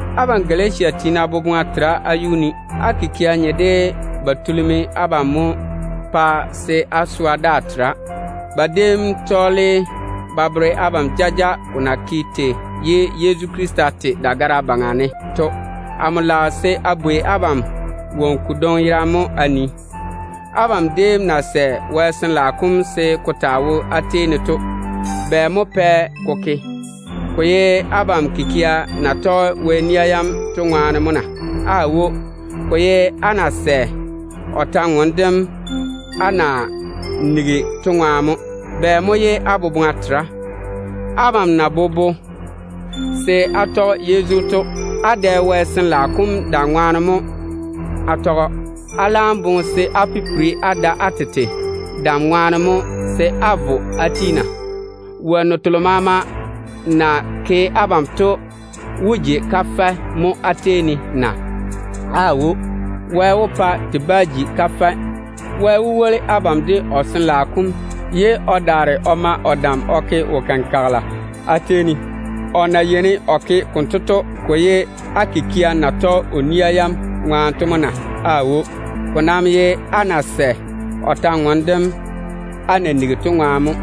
Abam Galatia tiina boboŋa tera á yuu ne. Bera mo tulimi abam pa se á swa daa tera? Ba déem tɔɔle ba bere abam jaja ko na ke tei ye Yezu Krista te dagara kam yuu ne to. Amo lage se a bwei abam woŋo kodwoŋi yerane mo a nii: Abam déem na sɛ Wɛ Sin-laao kom se ko taa wo á tei ne to, bɛ mo pɛ ko ke? Ko ye abam kikia na tɔge Wɛ ni-kaana yam to ŋwaane mo na? Aawo. Ko ye á na sɛ o kwor-ywoŋa kam á na nigi to ŋwaane mo. Bɛ mo ye á boboŋa jei konto? Abam na bobo se á tɔge Yezu to, á dɛ Wɛ Sin-laao kom dam ŋwaane mo á tɔge‑o. Á laam boŋe se á pipiri á da á tete dam ŋwaane mo se á vo á ti na? Wonnu telo maama na yi abam to wó ji kafɛ mo á tei ne na? Aawo. Te bá wane te ji kafɛ! Wɛ nam woli abam de o Sin-laao kom, ye o daare o ma o dam o ke wo-kenkagela á tei ne. O na ke konto to, ko ye á kikia na tɔge o nia yam to ŋwaane mo na? Aawo. Ko nam ye á na sɛ o kwor-ywoŋa kam á na nigi to ŋwaane mo.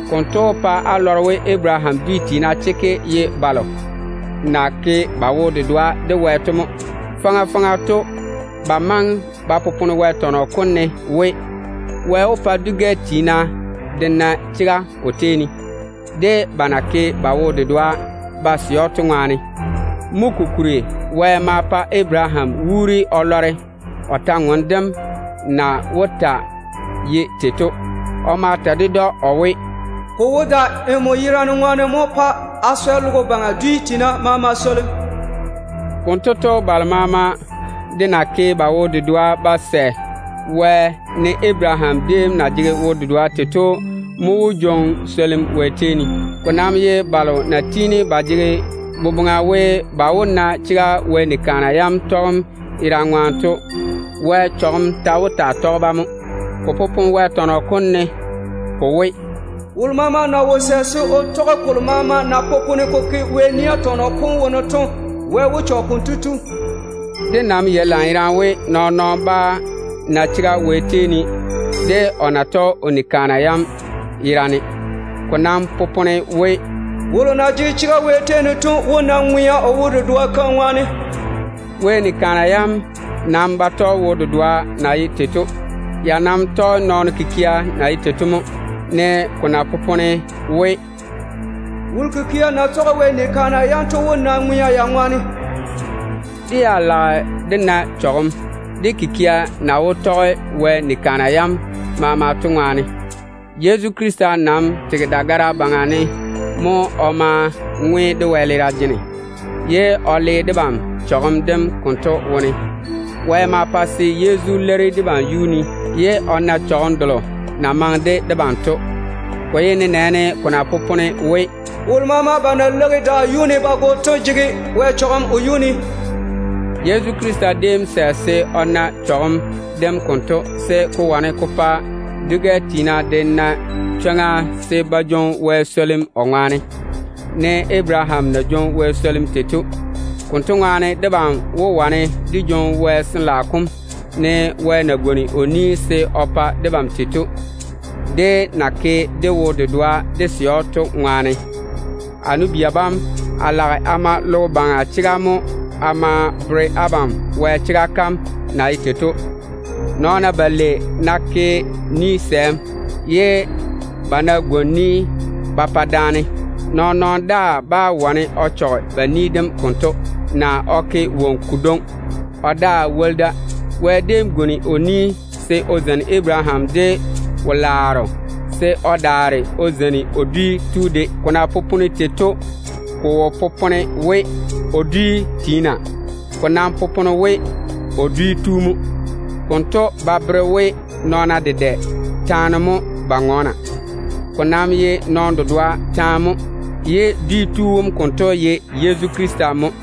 Konto wó pa á lɔre we, Abaraham dwi tiina chekke ye balo na ke ba wo-dedoa de Wɛ to mo. Faŋa faŋa to ba maŋe ba popone Wɛ tɔnɔ kom ne we, Wɛ wó pa dwi-gɛ tiina de na chega o tei ne, ba na ke ba wo-dedoa ded‑o to ŋwaane. Mo kokuri Wɛ ma pa Abaraham wuuri o lɔre o kwor-ywoŋa kam na wó taa ye tei to. O ma ta ded‑o o we, “Amo wó da nmo baŋa ne mo a swɛ logo baŋa dwi maama swolim.” Konto to, balo maama de na ke ba wo-dedoa de Wɛ, ne Abaraham déem na jege wo-dedoa tei to mo wó jwoŋi swolim Wɛ tei ne. Ko nam ná ye balo na tiini ba jege boboŋa we, ba wó na chega Wɛ ni-kaana yam tɔgem ŋwaane to, Wɛ sɔla ta wó taa wo ba baŋa ne mo. Ko popone Wɛ tɔnɔ kom ne ko we, “Wolo maama ná wo sɛ se o toŋe o tɔge kolo maama na popone ko ke Wɛ nia tɔnɔ kom wone to, Wɛ wó sɔɔle lwarem o yage kotu baŋa ne.” Dé nam yei lanyerane we, nɔɔn-nɔɔno bá na chega Wɛ tei ne de o ná tɔge o nia yam yerane. Ko nam popone we, “Wolo na jege chega Wɛ tei ne to wó na ŋwea o wo-dedoa kam ŋwaane.” Wɛ ni-kaana yam nam ba tɔge wo-dedoa keim na ye tei to. Ya nam tɔge nɔɔno kikia na ye tei to mo, ne ko na popone we, “Wolo kikia na yɔɔre ya tɔge Wɛ ni-kaana yam to wó na ŋwea ya baŋa ne.” Dé ya lage dé na chɔgem, dé kikia na wo tɔge Wɛ ni-kaana yam maama to ŋwaane. Yezu Krista nam tege dagara kam yuu ne mo o ma ŋwe de wɛleera jene, ye o le debam chɔgem dem konto wone. Wɛ ma pa se Yezu leiri debam yuu ne, ye o na chɔgem delo na maŋe de debam to. Ko ye nenɛɛne ko na popone we, “Wolo maama ba ná leigi daa yuu ne ba go, Wɛ sɔɔle lwarem mo o yage kotu yuu ne.” Yezu Krista déem sɛ se o na chɔgem dem konto, se ko wane ko pa dwi-gɛ tiina de na chwoŋa se ba na Wɛ swolim o ŋwaane, ne Abaraham na nɛ Wɛ swolim tei to. Konto ŋwaane, debam wó wane dé jwoŋi Wɛ Sin-laao kom, ne Wɛ na pwooli se o pa debam tei to, dé na ke dé wo-dedoa dé sɛ‑o to ŋwaane. A nu-bia bam, a lage a ma logo baŋa chega mo a ma bere abam Wɛ chega kam na ye tei to. Nɔɔna balei ná ke ni-sɛɛm, ye ba ná gwoni ni ba pa daane, nɔɔn-nɔɔno daa bá wane o chɔge ba ni dem konto, naa o ke woŋo kodwoŋi o daa woli da. Wɛ déem pwooli se o zeini Abaraham de wo-laaro, se o daare o zeini o dwi dem de. Ko na popone Wɛ tɔn-dwoŋo kom ne tei to, ko wo popone we, “o dwi tiina.” Ko nam popone we, “o dwi dem” mo. Konto ba bere we nɔɔna dedɛ taane mo ba ŋɔɔna. Ko nam ye nɔɔno dedoa taane mo, ye dwi tu wom konto ye Yezu Krista mo.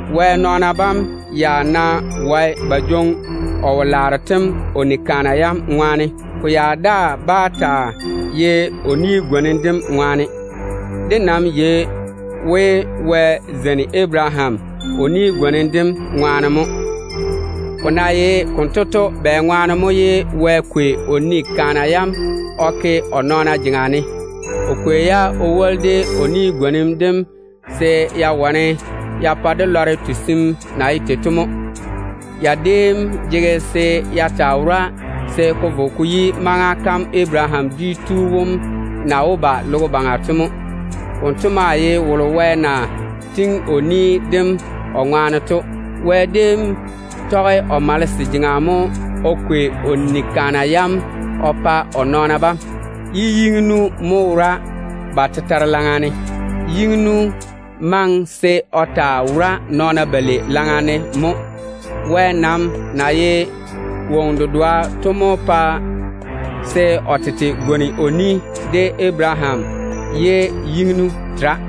Wɛ nɔɔna bam ya ná wae ba jwoŋi o wo-laaro tem o ni-kaana yam ŋwaane, ko ya daa bá taa ye o kampwola kam ŋwaane. Dé nam yei we, Wɛ déem zeini Abaraham o kampwola kam ŋwaane mo. Ko na ye konto to, bɛŋwaane mo Wɛ kwei o ni-kaana yam o ke o nɔɔna jeŋa ne? O kwei-ya o woli de o kampwola kam se ya wane ya pa dé lɔre tusim na ye tei to mo. Ya déem jege se ya taa wora se ko vo ko yi maŋa kam Abaraham dwi tu wom na wó ba logo baŋa to mo. Wonto maa ye wolo Wɛ na tiŋi o ni dem o ŋwaane to. Wɛ déem tɔge o malese jeŋa mo o kwei o nia yam o pa o nɔɔna bam, ye yiŋinu mo wora ba tetare laŋa ne. Yiŋinu maŋe se o taa wora nɔɔna balei laŋa ne mo. Wɛ nam na ye ŋo dedoa to mo pa se o tete gwoni o ni de Abaraham ye yiŋinu tera.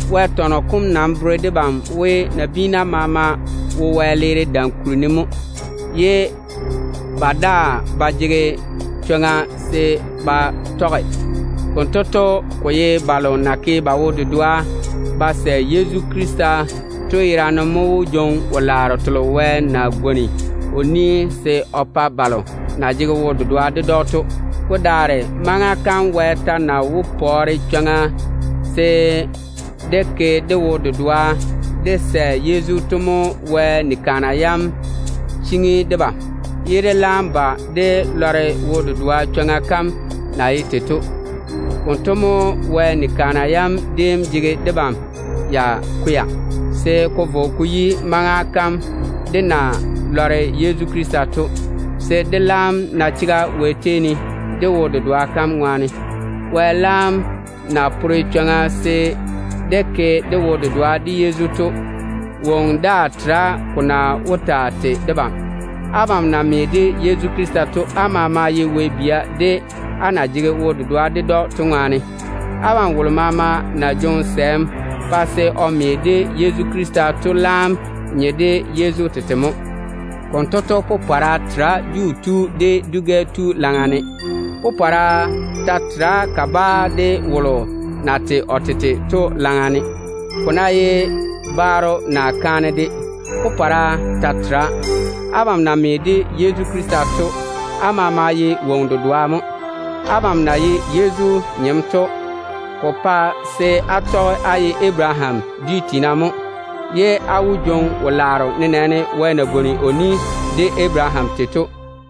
Wɛ tɔnɔ kom nam bere debam we, nabiina maama wo wɛleera dam kuri ne mo, ye ba daa ba jege chwoŋa se ba tɔge da ba ma jwoŋi ba tete. Konto to, ko ye balo na ke ba wo-dedoa ba sɛ Yezu Krista to mo wó jwoŋi wo-laaro telo Wɛ na pwooli se o pa-ba to, Yezu na jege ba chega to ŋwaane. Ko daare maŋa kam Wɛ ta na wo pore chwoŋa se dé ke dé wo-dedoa dé sɛ Yezu to mo Wɛ ni-kaana yam cheiŋi debam, ye dé laam ba dé lɔre wo-dedoa chwoŋa kam na ye tei to. Konto mo Wɛ ni-kaana yam déem jege debam ya kwɛa, se ko vo ko yi maŋa kam dé na lɔre Yezu Krista to, se dé laam na chega Wɛ tei ne dé wo-dedoa kam ŋwaane. Wɛ laam na pore chwoŋa se dé ke dé wo-dedoa de Yezu to, woŋo daa tera ko na wó taa tei debam. Abam na me de Yezu Krista to, á maama ye Wɛ bia, á na jege wo-dedoa ded‑o to ŋwaane. Abam wolo maama na jwoŋi sɛɛm pa se o me de Yezu Krista to laam nye de Yezu tete mo. Konto to, popɔra tera Juu tu de dwi-gɛ tu laŋa ne. Popɔra ta tera kabaa de wolo na tei o tete to laŋa ne. Ko ná ye baaro naa kaane de, popɔra ta tera. Abam na me de Yezu Krista to, á maama ye ŋo dedoa mo. Abam na ye Yezu nyem to, ko pa se á tɔge á ye Abaraham dwi tiina mo. Á maa wó jwoŋi wo-laaro, nenɛɛne Wɛ déem na pwooli kampwola de Abaraham tei to.